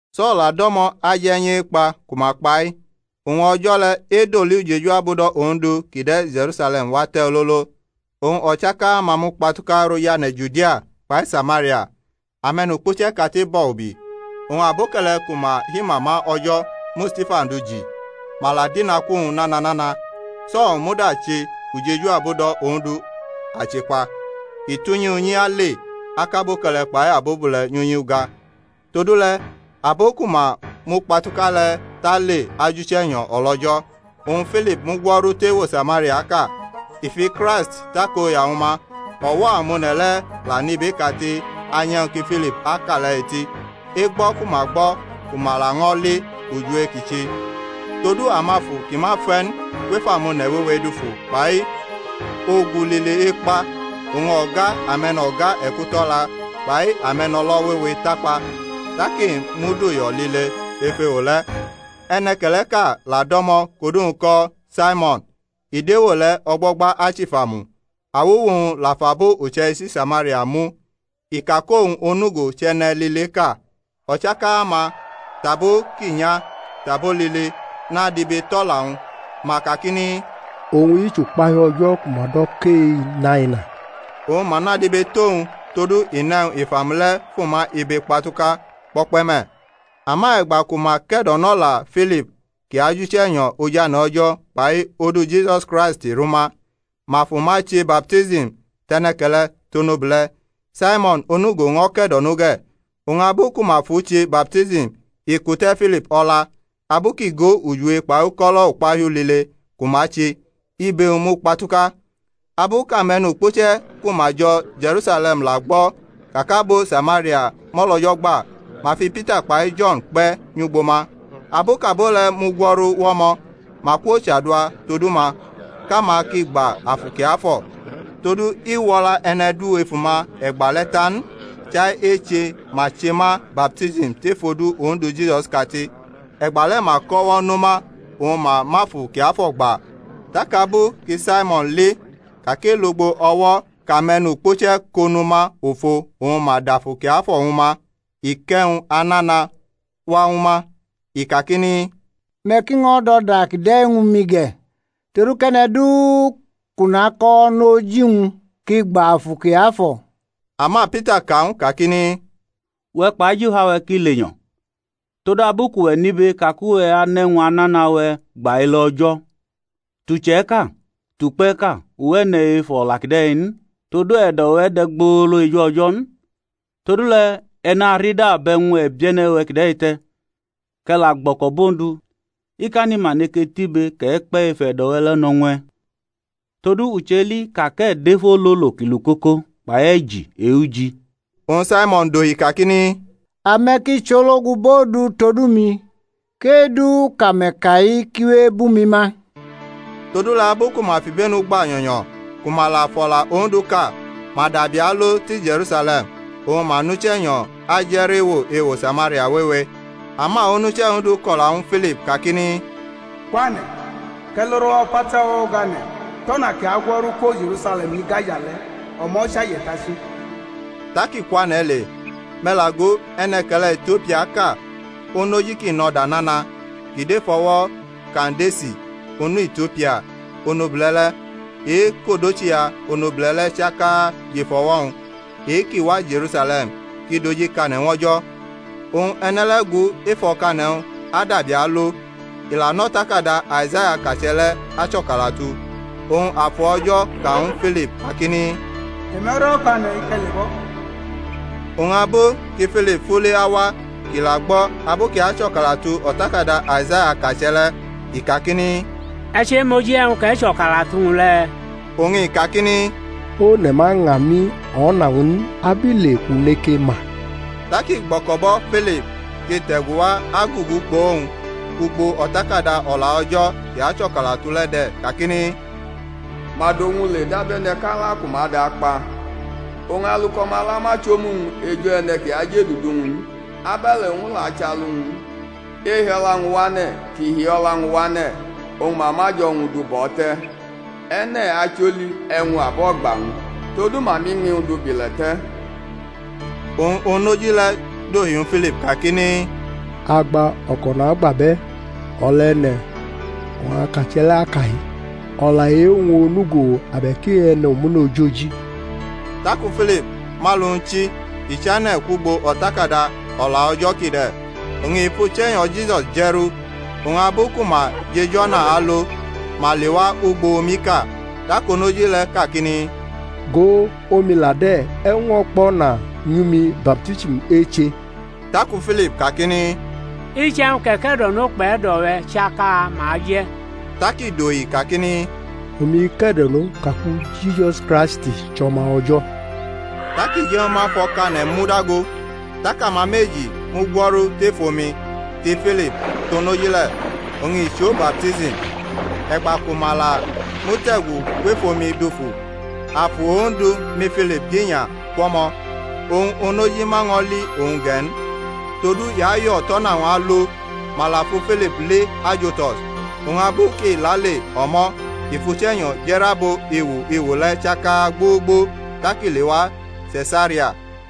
So̩l la do̩mo̩ aje̩nyʼekpa ku ma kpa-i. Oñ o̩jo̩ le̩ edoli ujeju abudo̩ Ondu ki de̩ Je̩rusale̩m wate̩ ololo. Oñ o̩chaka-ma mukpatuka rʼojane̩ Judia kpai Samaria; ame̩nukpuche̩ kate bo̩ ubi. Oñ aboke̩le̩ ku ma himama O̩jo̩ mu Stifan du ji; ma la dinaku-wñ nana nana. So̩l muda che ujeju abudo̩ Ondu achekpa, i tʼunyi unyi ale akʼaboke̩le̩ kpai abobule̩ nyʼunyi uga. Todule̩ abo ku ma mukpatuka le̩ tale ajʼuche̩nyo̩ o̩lO̩jo̩. Oñ Filip mugwo̩ru tʼewo Samariaʼka, i fi Kraist takoya ñwu ma. O̩wo̩ amone̩ le̩ la nʼibeʼkate anyʼe̩wñ ki Filip aka le̩ e̩ti, e̩gbʼo̩ ku ma gbo̩ ku ma laño̩ li ujiwe kʼi che. Todu amafu ki ma fe̩ n kwef amone̩ wewe dufu kpai ogu lile ekpa; oñ o̩ga ame̩no̩ga e̩kuto̩la kpai ame̩no̩lo̩ wewe takpa. Tak i mud uyo̩ lile ef ewo le̩. E̩ne̩ke̩le̩ʼka la do̩mo̩ kʼodu-wñ ko̩ Saimo̩n, i dʼewo le̩ o̩gbo̩gba achifamu; awuwu-wñ la fʼabo uche̩ichi Samaria mu, i ka kʼowñ onugo chʼe̩ne̩ lileʼka. O̩chaka-ma, tʼabo ki nya, tʼabo lile, nadibetʼo̩la-wñ, ma kakini, owñ-i chʼukpahiu O̩jo̩ ku ma do̩ kʼe-Inaina. Oñ ma nadibetʼowñ todu i nʼe̩wñ ifamu le̩ fʼuma ibe kpatuka kpo̩kpe̩ me̩. Ama e̩gba ku ma ke̩do̩nʼo̩la Filip kʼi ajʼuche̩nyo̩ ojane̩ O̩jo̩ kpai odu Jisus Kraist! rʼuma, ma fʼuma che baptism, tʼe̩ne̩ke̩le̩, tʼonobule̩. Saimo̩n onugo ño̩ ke̩do̩no ge̩; oñ abu ku ma fʼu che baptism i kute̩ Filip o̩la. Abu kʼi go ujiwe kpai uko̩lo̩ ukpahiu lile ku ma che, ibe-wñ mukpatuka. Abu kʼamenukpuche̩ ku ma jo̩ Je̩rusale̩m la gbo̩ ka kʼabo Samaria mʼo̩lO̩jo̩ gba, ma fi Pita kpai Jo̩n kpe̩ nyʼugbo ma. Abu kʼabo le̩ mugwo̩ru wʼo̩mo̩, ma kwochadua todu ma, kʼama ki gba Afu Kiafo̩. Todu i wʼo̩la e̩ne̩ du ef uma e̩gba le̩ ta n; chai eche ma che ma baptism tef odu Ondu Jisus kate. E̩gbale̩ ma kʼo̩wo̩ no ma oñ ma mʼAfu Kiafo̩ gba. Tak abu ki Saimo̩n li ka kʼi lugbo o̩wo̩ kʼame̩nukpuche̩ ko nʼuma ofo oñ ma dʼAfu Kiafo̩ ñwu ma, i kʼe̩wñ anana wa ñwu ma, i kakini, Me̩ ki ño̩ dʼo̩da kide̩ ñwu mi ge̩, todu kʼe̩ne̩ du kʼu nakʼo̩wo̩ nʼoji-wñ kʼi gba Afu Kiafo̩. Ama Pita ka ñw u kakini, Uwe̩ kpʼajifa-we̩ ki lenyo̩, todabu kʼuwe̩ nʼibe ka kʼuwʼanʼe̩wñ anana-we̩ gba ele O̩jo̩. Tʼuche̩ʼka, tʼukpe̩ʼka, uwe̩ ne̩ ef o̩la kide̩ n: todu e̩do̩-we̩ de̩ gbolo eju O̩jo̩ n. Todule̩ e̩ narida bʼe̩wñ e̩bie̩ne̩-we̩ kide̩ te̩, kʼe̩ la gbo̩ko̩ bʼOndu, ikani ma neke tʼibe kʼe̩ kpe̩ ef e̩do̩-we̩ le̩ no̩ ñw e̩. Todu u cheli ka kʼe̩ dʼef ololo ki lukoko kpai e̩ji e-uji. Oñ Saimon dohi kakini, Ame̩ ki chologu bʼOndu todu mi, kʼe-du kʼame̩ ka-i ki we ebʼumi ma. Todule̩ abu ku ma fʼibenu gba nyo̩nyo̩ ku ma la fʼo̩la Ondu ka, ma dabi alo ti Je̩rusale̩m, oñ ma nʼUche̩nyo̩ aje̩ rʼewo ewo Samaria wewe. Ama onuche̩ Ondu ko̩la ñwu Filip kakini, Kwane̩, kʼe̩ lo rʼo̩wo̩ o̩pata o̩wo̩ o̩gane̩, tʼo̩na ki agwo̩ru kwo Je̩rusale̩m nyi Gaza le̩; o̩mo̩ chʼaje̩tachi. Tak i kwane̩ le. Me̩ la go, e̩ne̩ke̩le̩ Itiopiaʼka, onoji kʼi nʼo̩da nana kʼi dʼef o̩wo̩ Kandesi onu Itiopia onobule̩ le̩, e-kʼodochiya onobule̩ le̩ chaka jʼef o̩wo̩-wñ, e-kʼi wa Je̩rusale̩m kʼi dojikane̩ ñw O̩jo̩; oñ e̩ne̩ le̩ gu ef o̩kane̩-wñ adabi alo, i la nʼo̩takada Aizaya akache̩ le̩ acho̩kalatu. Oñ Afu O̩jo̩ ka ñwu Filip kakini, Te̩me̩rʼo̩kane̩-i kʼe̩ lebʼo̩. Oñ abu ki Filip fule awa kʼi la gbo̩ abu kʼi acho̩kalatu o̩takada Aizaya akache̩ le̩, i kakini, E̩ chemoji e̩wñ kʼe̩ cho̩kalatu-wñ le̩? Oñ i kakini, One̩ ma ña mi o̩na-wñ n abile kʼu neke ma? Tak i gbo̩ko̩ bo̩ Filip kʼi te̩gu wa agugu kpʼowñ. Ugbo O̩takada O̩la O̩jo̩ kʼi acho̩kalatu le̩ de̩ kakini, Ma dʼowñ le dabe̩ne̩ kʼala ku ma dʼakpa; oñ alu kʼo̩mala ma chʼomu-wñ eju e̩ne̩ ki ajʼedudu-wñ n, abe̩le̩ owñ la achʼalu-wñ n. Ehi o̩la-wñ wane̩ kʼi hi o̩la-wñ wane̩ oñ ma mʼajo̩-wñ du bʼo̩ te̩. E̩ne̩ acholi e̩wñ abo̩gba-wñ? Todu ma mʼiñmi-wñ du bʼile̩ te̩. Oñ onoji le̩ dohi ñwu Filip kakini, Agba, o̩ko̩ nagba bʼe̩, o̩la e̩ne̩ oñ akache̩ le̩ ka-i? o̩la e-wñ onugo abe̩k e-e̩ne̩ omune̩ ojoji? Taku Filip mʼalu-wñ chi i chane̩ kwugbo O̩takada O̩la O̩jo̩ kide̩, oñ i fʼUche̩nyo̩ Jisus je̩rʼu. Oñ abu ku ma jʼej o̩na alo, ma lewa ugbo omiʼka. Tak onoji le̩ kakini, Go, omi la de̩; e̩wñ ño̩ kpo̩na nyʼumi baptism eche? [ Taku Filip kakini, Iche̩wñ kʼe̩ ke̩do̩no kpʼe̩do̩-we̩ chaka ma je̩. Tak i dohi kakini, Omi ke̩do̩no ka ku Jisus Kraist chʼO̩ma O̩jo̩.] Tak i je̩ ñwu ma fʼo̩kane̩ mu dago; tak ama meji mu gwo̩ru tef omi, ti Filip, tʼonoji le̩, oñ i chʼo baptism. E̩gba ku ma la mute̩gu kwef omi dufu, Afu Ondu mi Filip dinya kwʼo̩mo̩; oñ onoji ma ño̩ li owñ ge̩ n, todu i ayo̩ tʼo̩na-wñ alo. Ma la fu Filip li Azotos. Oñ abu kʼi lale o̩mo̩ i fʼuche̩nyo̩ je̩rʼabo ewo ewo le̩ chaka gbogbo tak i lewa Se̩saria.